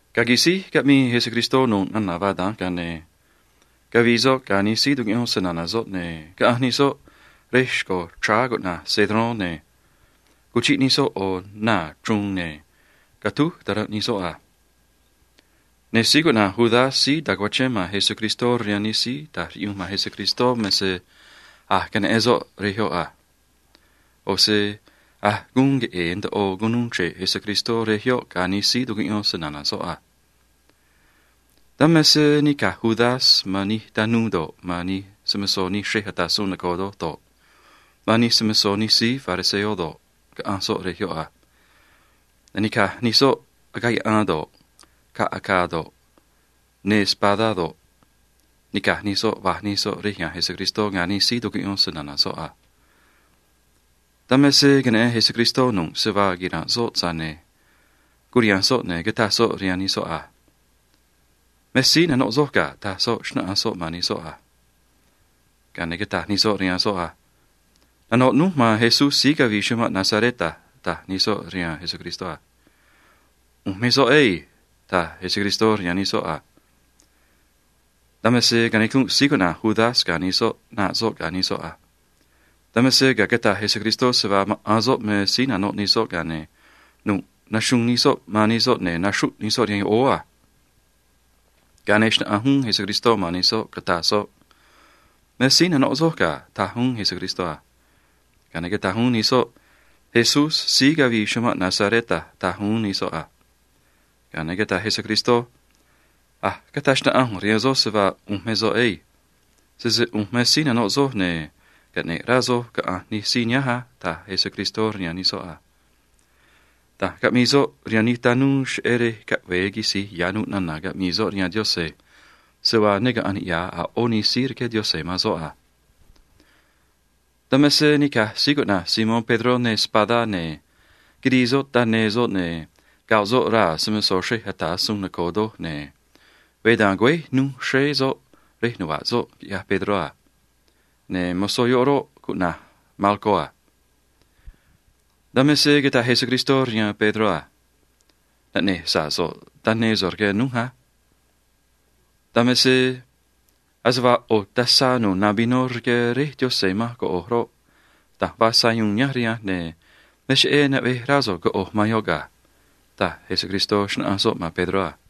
Ga̱a quisíj caꞌmii Jesucristó nu̱ꞌ nana̱ vaa da̱nj, ga̱a ne̱ cavii soꞌ ga̱ nij síí tucuꞌyón se‑na̱na̱ soꞌ, ne̱ caꞌanj nij soꞌ rej xco̱ chráá cuꞌna̱j Cedrón, ne̱ cuchiꞌ nij soꞌ ꞌo̱ naa̱ chruun, ne̱ catúj taranꞌ nij soꞌ a. Ne̱ síí cuꞌna̱j Judas síí ta̱cuachén man Jesucristó rihaan nij síí ta̱j riꞌyunj man Jesucristó me se a̱j queneꞌen soꞌ rej yoꞌ a. ꞌO̱ se a̱j guun queꞌe̱e̱ ndoꞌo cunuu chre̱ꞌ Jesucristó rej yoꞌ ga̱ nij síí tucuꞌyón se‑na̱na̱ soꞌ a. Dan me se nica̱j Judas man nij tanuu do̱ꞌ, man nij se‑mo̱zó nij xrej ata̱ suun noco̱o doj do̱ꞌ, man nij se‑mo̱zó nij síí fariseo do̱ꞌ, caꞌanj soꞌ rej yoꞌ a. Ne̱ nica̱j nij soꞌ agaꞌ yaꞌan do̱ꞌ, caꞌ acaa do̱ꞌ, neê espadá do̱ꞌ, nica̱j nij soꞌ va̱j nij soꞌ rej ya̱nj Jesucristó ga̱ nij síí tucuꞌyón se‑na̱na̱ soꞌ a. Dan me se queneꞌen Jesucristó nu̱ꞌ se vaa quira̱nꞌ soꞌ, tza̱j ne̱ curiha̱nj soꞌ, ne̱ cataj soꞌ rihaan nij soꞌ a: ―Me síí nanoꞌ soj ga̱ ―taj soꞌ, xnáꞌanj soꞌ man nij soꞌ a. Ga̱a ne̱ cataj nij soꞌ rihaan soꞌ a: ―Nanoꞌ núj man Jesús síí cavii chumanꞌ Nazaret a ―taj nij soꞌ rihaan Jesucristó a. ―ꞌU̱nj me soꞌ ei ―taj Jesucristó rihaan nij soꞌ a. Dan me se canicunꞌ síí cuꞌna̱j Judas ga̱ nij soꞌ ꞌnaꞌ soꞌ ga̱ nij soꞌ a. Dan me se ga̱a cataj Jesucristó se vaa maꞌa̱n soꞌ me síí nanoꞌ nij soꞌ, ga̱a ne̱ nu̱ꞌ naxuun nij soꞌ man nij soꞌ, ne̱ naxruꞌ nij soꞌ rihaan yoꞌóó a. Ga̱a ne̱ xnáꞌanj uún Jesucristó man nij soꞌ, cataj soꞌ: ―Me síí nanoꞌ soj ga̱ ―taj uún Jesucristó a. Ga̱a ne̱ cataj uún nij soꞌ: ―Jesús síí cavii chumanꞌ Nazaret a ―taj uún nij soꞌ a. Ga̱a ne̱ cataj Jesucristó: ―A̱j cataj xnaꞌanj ꞌu̱nj rihaan soj se vaa ꞌu̱nj me soꞌ ei. Sese ꞌu̱nj me síí nanoꞌ soj, ne̱ caꞌne̱ꞌ rá soj caꞌa̱nj nij síí nihánj á ―taj Jesucristó rihaan nij soꞌ a. Da̱nj caꞌmii soꞌ rihaan nij tanuu cheꞌé rej caꞌve̱e quisi̱j ya̱ nu̱ꞌ nana̱ caꞌmii soꞌ rihaan Diose̱ se vaa ne caꞌa̱nj niꞌya̱ a̱ ꞌó nij síí rqué Diose̱ man soꞌ a. Dan me se nica̱j síí cuꞌna̱j Simón Pedró neê espadá, ne̱ quirii soꞌ taneê soꞌ, ne̱ goꞌ soꞌ raa̱ se‑mo̱zó xrej ata̱ suun noco̱o doj, ne̱ veé da̱nj güéj nuj xréé soꞌ rej nuva̱ꞌ soꞌ, quiꞌyaj Pedró a. Ne̱ mozó yoꞌ roꞌ, cuꞌna̱j Malco a. Dan me se cataj Jesucristó rihaan Pedró a: ―Naꞌne̱j sa̱ꞌ so̱ꞌ taneê so̱ꞌ rque nuj á. Dan me se ase vaa ꞌo̱ tazá nu̱u̱ na vinó rqué Réj Diose̱ manj coꞌo̱j roꞌ, da̱nj vaa sayuun nihánj rihanj, ne̱ me cheꞌé naꞌvej rá so̱ꞌ coꞌo̱j man yoꞌ ga̱ ―taj Jesucristó, xnáꞌanj soꞌ man Pedró a.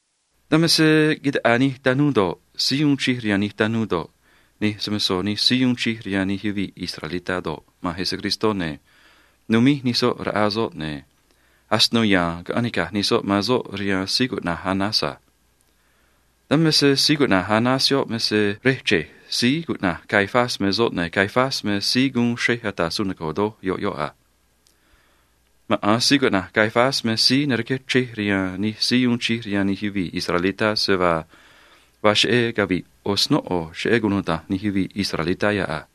Dan me se quitaꞌaa nij tanuu do̱ꞌ, síí uun chij rihaan nij tanuu do̱ꞌ, nij se‑mo̱zó nij síí uun chij rihaan nij yuvii̱ israelitá do̱ꞌ, man Jesucristó, ne̱ numíj nij soꞌ raꞌa soꞌ, ne̱ asino ya̱a̱n caꞌanj nica̱j nij soꞌ man soꞌ rihaan síí cuꞌna̱j Anás a. Dan me se síí cuꞌna̱j Anás yoꞌ me se rej che̱j síí cuꞌna̱j Caifás me soꞌ, ne̱ Caifás me síí guun xrej ata̱ suun noco̱o doj yoꞌ yoꞌ a. Maꞌa̱n síí cuꞌna̱j Caifás me síí narqué chrej rihaan nij síí uun chij rihaan nij yuvii̱ israelitá se vaa vaa cheꞌé cavi̱ꞌ ꞌo̱ snóꞌo cheꞌé cunuda̱nj nij yuvii̱ israelitá yoꞌ a.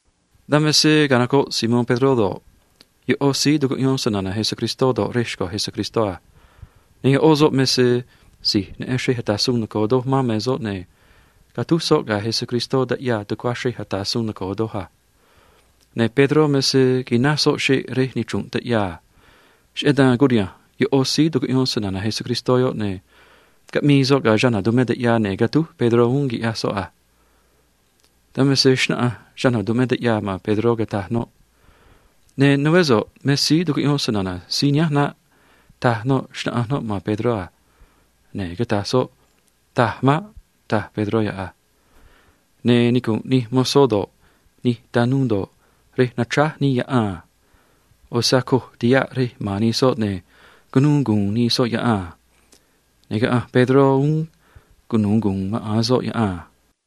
Dan me se canocoꞌ Simón Pedró do̱ꞌ, yoꞌó síí tucuꞌyón se‑na̱na̱ Jesucristó do̱ꞌ, rej xco̱ Jesucristó a. Ne̱ yoꞌó soꞌ me se si̱j neꞌen xrej ata̱ suun noco̱o doj man me soꞌ, ne̱ catúj soꞌ ga̱ Jesucristó taꞌyaa tucuá xrej ata̱ suun noco̱o doj a. Ne̱ Pedró me se quináj soꞌ xeꞌ rej nichru̱nꞌ taꞌyaa a. Cheꞌé dan curiha̱nj yoꞌó síí tucuꞌyón se‑na̱na̱ Jesucristó yoꞌ, ne̱ caꞌmii soꞌ ga̱ chana̱ tumé taꞌyaa, ne̱ catúj Pedró uún, quiꞌyaj soꞌ a. Dan me se xnáꞌanj chana̱ tumé taꞌyaa man Pedró, cataj noꞌ: ―Ne̱ nuvé so̱ꞌ me síí tucuꞌyón se‑na̱na̱ síí nihánj naꞌ ―taj noꞌ, xnáꞌanj noꞌ man Pedró a. Ne̱ cataj soꞌ: ―Taj maꞌ ―taj Pedró yoꞌ a. Ne̱ nicu̱nꞌ nij mozó do̱ꞌ, nij tanuu do̱ꞌ, rej nachráj nii yaꞌan a. ꞌO̱ se acoj tihaꞌ rej ma̱n nij soꞌ, ne̱ cunuu gu̱u̱n nij soꞌ yaꞌan a. Ne̱ caꞌanj Pedró uún cunu̱u gu̱u̱n maꞌa̱n soꞌ yaꞌan a.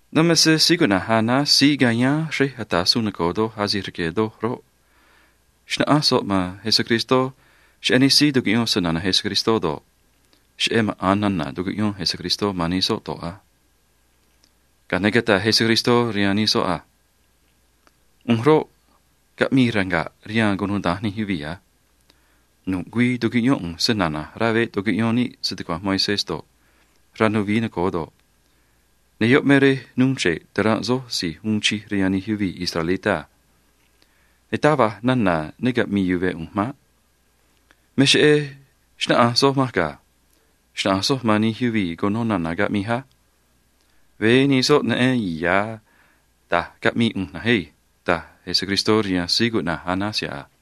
Dan me se síí cuꞌna̱j Anás síí cayáán xrej ata̱ suun noco̱o doj asi̱j rque̱ doj roꞌ, xnáꞌanj soꞌ man Jesucristó cheꞌé nij síí tucuꞌyón se‑na̱na̱ Jesucristó do̱ꞌ, cheꞌé maꞌa̱n nana̱ tucuꞌyón Jesucristó man nij soꞌ do̱ꞌ a. Ga̱a ne̱ cataj Jesucristó rihaan nij soꞌ a: ―ꞌU̱nj roꞌ, caꞌmii ranga̱ꞌ rihaan cunuda̱nj nij yuvii̱ a. Nu̱ꞌ güii tucuꞌyón ꞌu̱nj se‑na̱na̱j rá veꞌ tucuꞌyón níꞌ se‑tucua̱nj Moisés do̱ꞌ, rá nuvií noco̱o do̱ꞌ, ne̱ yoꞌ me rej nuu chre̱ꞌ taranꞌ soj si̱j uun chij rihaan nij yuvii̱ israelitá a. Ne̱ taj va̱j nana̱ ne caꞌmi̱i̱ yuve̱ ꞌu̱nj maꞌ. Me cheꞌé xnáꞌanj soj manj ga̱. Xna̱ꞌanj soj man nij yuvii̱ cuno nana̱ caꞌmij á. Veé nij soꞌ neꞌen ya̱ da̱j caꞌmii ꞌu̱nj na̱nj ei ―taj Jesucristó rihaan síí cuꞌna̱j Anás yoꞌ a.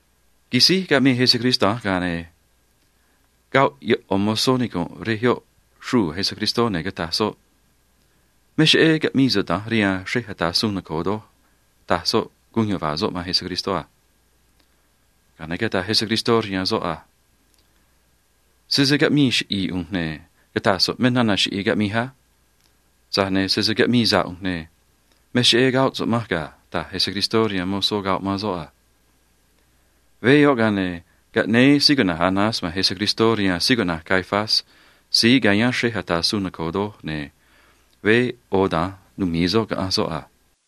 Quisíj caꞌmii Jesucristó da̱nj, ga̱a ne̱ coxro yoꞌo̱ mozó nicu̱nꞌ rej yoꞌ xruu̱ Jesucristó, ne̱ cataj soꞌ: ―Me cheꞌé caꞌmii so̱ꞌ da̱nj rihaan xrej ata̱ suun noco̱o doj ―taj soꞌ, guun yuva̱a̱ soꞌ man Jesucristó a. Ga̱a ne̱ cataj Jesucristó rihaan soꞌ a: ―Sese caꞌmii chiꞌi̱i̱ ꞌu̱nj, ne̱ cata̱j so̱ꞌ me nana̱ chiꞌi̱i̱ caꞌmij á. Tza̱j ne̱ sese caꞌmii sa̱ꞌ ꞌu̱nj, ne̱ me cheꞌé coxro so̱ꞌ manj ga̱ ―taj Jesucristó rihaan mozó coxro man soꞌ a. Veé yoꞌ, ga̱a ne̱ caꞌnéé síí cuꞌna̱j Anás man Jesucristó rihaan síí cuꞌna̱j Caifás síí cayáán xrej ata̱ suun noco̱o doj, ne̱ veé ꞌo̱ da̱nj numi̱i soꞌ caꞌanj soꞌ a.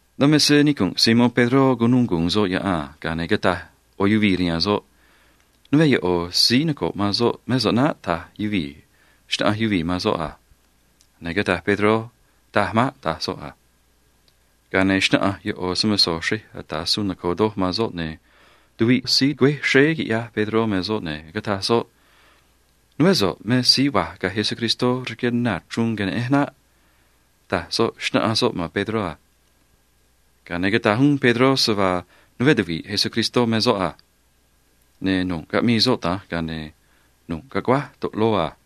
Dan me se nicu̱nꞌ Simón Pedró cunuu gu̱u̱n soꞌ yaꞌan a. Ga̱a ne̱ cataj ꞌo̱ yuvii̱ rihaan soꞌ: ―Nuveé yoꞌo̱ síí noco̱ꞌ man soꞌ mé so̱ꞌ naꞌ ―taj yuvii̱, xnáꞌanj yuvii̱ man soꞌ a. Ne̱ cataj Pedró: ―Taj maꞌ ―taj soꞌ a. Ga̱a ne̱ xnáꞌanj yoꞌo̱ se‑mo̱zó xrej ata̱ suun noco̱o doj man soꞌ, ne̱ tuviꞌ síí güéj xréé quiꞌyaj Pedró me soꞌ, ne̱ cataj soꞌ: ―Nuveé so̱ꞌ me síí va̱j ga̱ Jesucristó rque naa̱ chruun queneꞌenj naꞌ ―taj soꞌ, xnáꞌanj soꞌ man Pedró a. Ga̱a ne̱ cataj uún Pedró se vaa nuveé tuvi̱ꞌ Jesucristó me soꞌ a. Ne̱ nu̱ꞌ caꞌmii soꞌ da̱nj, ga̱a ne̱ nu̱ꞌ caguáj toꞌloo a.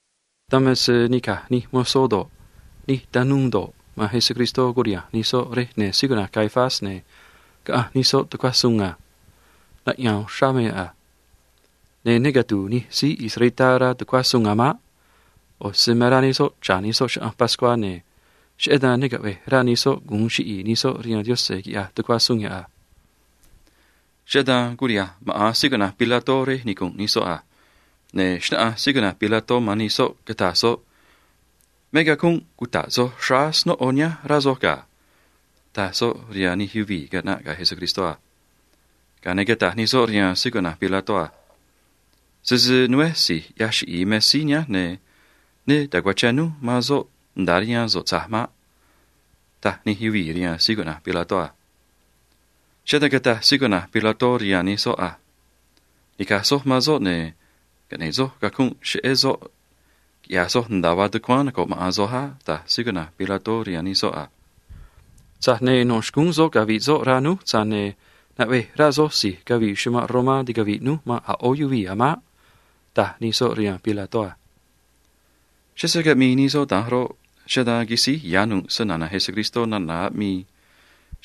Dan me se nica̱j nij mozó do̱ꞌ, nij tanuu do̱ꞌ, man Jesucristó curiha̱nj nij soꞌ rej ne̱ síí cuꞌna̱j Caifás, ne̱ caꞌanj nij soꞌ tucuá suun a. Naꞌya̱a̱n uxrá me yoꞌ a. Ne̱ ne catu̱u̱ nij síí israelitá rá tucuá suun a̱ maꞌ. ꞌO̱ se me rá nij soꞌ cha̱ nij soꞌ chaꞌanj pascuá, ne̱ cheꞌé dan ne caꞌve̱j rá nij soꞌ gu̱un chiꞌi̱i̱ nij soꞌ rihaan Diose̱ quiꞌya̱j tucuá suun yoꞌ a. Cheꞌé dan curiha̱nj maꞌa̱n síí cuꞌna̱j Pilato rej nicu̱nꞌ nij soꞌ a. Ne̱ xnáꞌanj síí cuꞌna̱j Pilato man nij soꞌ, cataj soꞌ: ―Me cacunꞌ cuta̱ꞌ soj xráá snóꞌo nihánj, rá soj ga̱ ―taj soꞌ rihaan nij yuvii̱ caꞌnaꞌ ga̱ Jesucristó a. Ga̱a ne̱ cataj nij soꞌ rihaan síí cuꞌna̱j Pilato a: ―Sese nuveé si̱j ꞌyaj chiꞌi̱i̱ me síí nihánj, ne̱ ne ta̱cuachén núj man soꞌ nda̱a rihaan so̱ꞌ tza̱j maꞌ ―taj nij yuvii̱ rihaan síí cuꞌna̱j Pilato a. Cheꞌé dan cataj síí cuꞌna̱j Pilato rihaan nij soꞌ a: ―Ni̱caj soj man soꞌ, ne̱ caꞌne̱ꞌ soj cacunꞌ cheꞌé soꞌ, quiꞌya̱j soj nda̱a vaa tucuáán noco̱ꞌ maꞌa̱n soj á ―taj síí cuꞌna̱j Pilato rihaan nij soꞌ a. ―Tza̱j ne̱ no̱ xcúún soꞌ cavi̱ꞌ soꞌ, rá núj, tza̱j ne̱ naꞌvej rá soj si̱j cavii chumanꞌ Romá ticavi̱ꞌ núj man a̱ ꞌó yuvii̱ a̱ maꞌ ―taj nij soꞌ rihaan Pilato a. Cheꞌé se caꞌmii nij soꞌ da̱nj roꞌ, cheꞌé dan quisíj ya̱ nu̱ꞌ se‑na̱na̱ Jesucristó nana̱ aꞌmii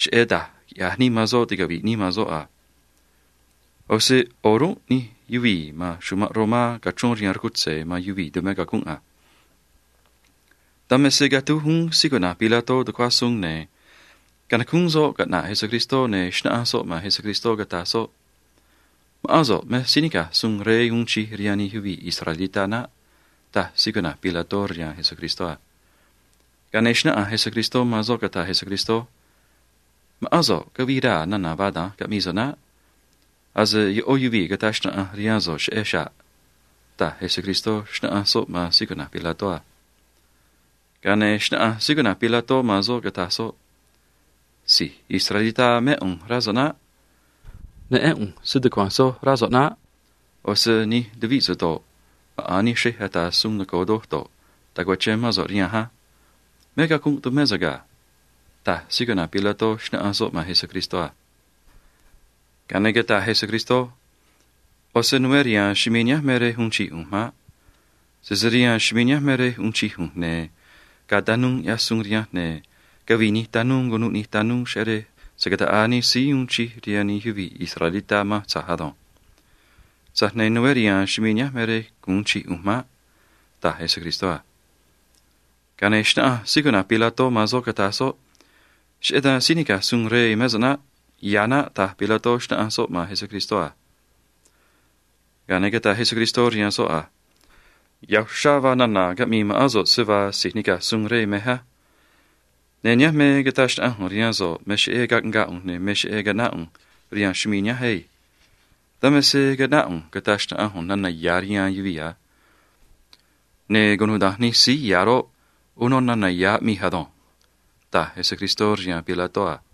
cheꞌé da̱j quiꞌya̱j nii man soꞌ ticavi̱ꞌ nii man soꞌ a. ꞌO̱ se o̱rúnꞌ nij yuvii̱ ma̱n chumanꞌ Romá cachrón rihaan rcutze̱ man yuvii̱ tumé cacunꞌ a. Dan me se catúj uún síí cuꞌna̱j Pilato tucuá suun, ne̱ canacúún soꞌ caꞌna̱ꞌ Jesucristó, ne̱ xnáꞌanj soꞌ man Jesucristó, cataj soꞌ: ―Ma̱ꞌán so̱ꞌ me síí nica̱j suun rey uun chij rihaan nij yuvii̱ israelitá naꞌ ―taj síí cuꞌna̱j Pilato rihaan Jesucristó a. Ga̱a ne̱ xnáꞌanj Jesucristó man soꞌ, cataj Jesucristó: ―Ma̱ꞌán so̱ꞌ cavii raa̱ nana̱ vaa da̱nj caꞌmii so̱ꞌ naꞌ. Ase yoꞌó yuvii̱ cataj xnaꞌanj rihaan so̱ꞌ cheꞌej xa̱ꞌ ―taj Jesucristó, xnáꞌanj soꞌ man síí cuꞌna̱j Pilato a. Ga̱a ne̱ xnáꞌanj síí cuꞌna̱j Pilato man soꞌ, cataj soꞌ: ―Si̱j israelitá mé ꞌu̱nj, rá so̱ꞌ naꞌ. Neꞌén ꞌu̱nj se‑tucua̱nj soj, rá so̱ꞌ naꞌ. ꞌO̱ se nij tuvíꞌ so̱ꞌ do̱ꞌ, maꞌa̱n nij xrej ata̱ suun noco̱o doj do̱ꞌ, tacuachén mán so̱ꞌ rihanj á. Me cacunꞌ tumé so̱ꞌ ga̱ ―taj síí cuꞌna̱j Pilato, xnáꞌanj soꞌ man Jesucristó a. Ga̱a ne̱ cataj Jesucristó: ―ꞌO̱ se nuveé riha̱a̱n chumii̱ nihánj me rej uun chij ꞌu̱nj maꞌ. Sese rihaan chumii̱ nihánj me rej uun chij ꞌu̱nj, ne̱ gaa tanuu ꞌyaj suun rihanj, ne̱ cavii nij tanuu, cunuꞌ nij tanuu, cheꞌé rej se̱ cataꞌaa nij síí uun chij rihaan nij yuvii̱ israelitá manj tza̱j ado̱nj. Tza̱j ne̱ nuveé riha̱a̱n chumii̱ nihánj me rej gu̱un chij ꞌu̱nj maꞌ ―taj Jesucristó a. Ga̱a ne̱ xnáꞌanj síí cuꞌna̱j Pilato man soꞌ, cataj soꞌ: ―Cheꞌé dan síí nica̱j suun rey mé so̱ꞌ naꞌ. Ya̱ naꞌ ―taj Pilato, xnáꞌanj soꞌ man Jesucristó a. Ga̱a ne̱ cataj Jesucristó rihaan soꞌ a: ―Ya̱ uxrá vaa nana̱ caꞌmii ma̱ꞌán so̱ꞌ se vaa si̱j nica̱j suun rey mej á. Ne̱ nihánj me cata̱j xnaꞌanj ꞌu̱nj rihaan so̱ꞌ me cheꞌé caꞌngaa ꞌu̱nj ne̱ me cheꞌé caꞌnáꞌ ꞌu̱nj rihaan chumii̱ nihánj ei. Dan me se caꞌnáꞌ ꞌu̱nj cata̱j xnaꞌanj ꞌu̱nj nana̱ ya̱ rihaan yuvii̱ a. Ne̱ cunuda̱nj nij síí ya̱ roꞌ, uno nana̱ ya̱ aꞌmij ado̱nj ―taj Jesucristó rihaan Pilato a.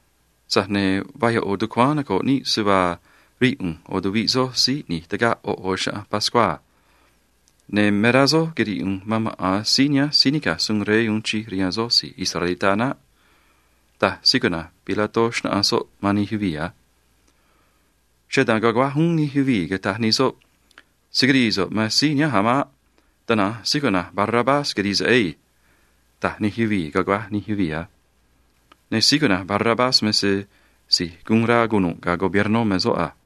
Tza̱j ne̱ vaa yoꞌo̱ tucuáán noco̱ꞌ níꞌ se vaa rii ꞌu̱nj ꞌo̱ tuviꞌ soj síí ꞌni̱j tagaꞌ ꞌo̱ ꞌo̱ chaꞌanj pascuá a. Ne̱ me rá soj quiri̱i̱ ꞌu̱nj man maꞌa̱n síí nihánj síí nica̱j suun rey uun chij rihaan soj si̱j israelitá naꞌ ―taj síí cuꞌna̱j Pilato, xnáꞌanj soꞌ man nij yuvii̱ a. Cheꞌé dan caguáj uún nij yuvii̱, cataj nij soꞌ: ―Se̱ quirii so̱ꞌ man síí nihánj a̱ maꞌ. Tana̱nj síí cuꞌna̱j Barrabás quiri̱i̱ so̱ꞌ ei ―taj nij yuvii̱, caguáj nij yuvii̱ a. Ne̱ síí cuꞌna̱j Barrabás me se si̱j guun rá cunu̱ꞌ ga̱ gobiernó me soꞌ a.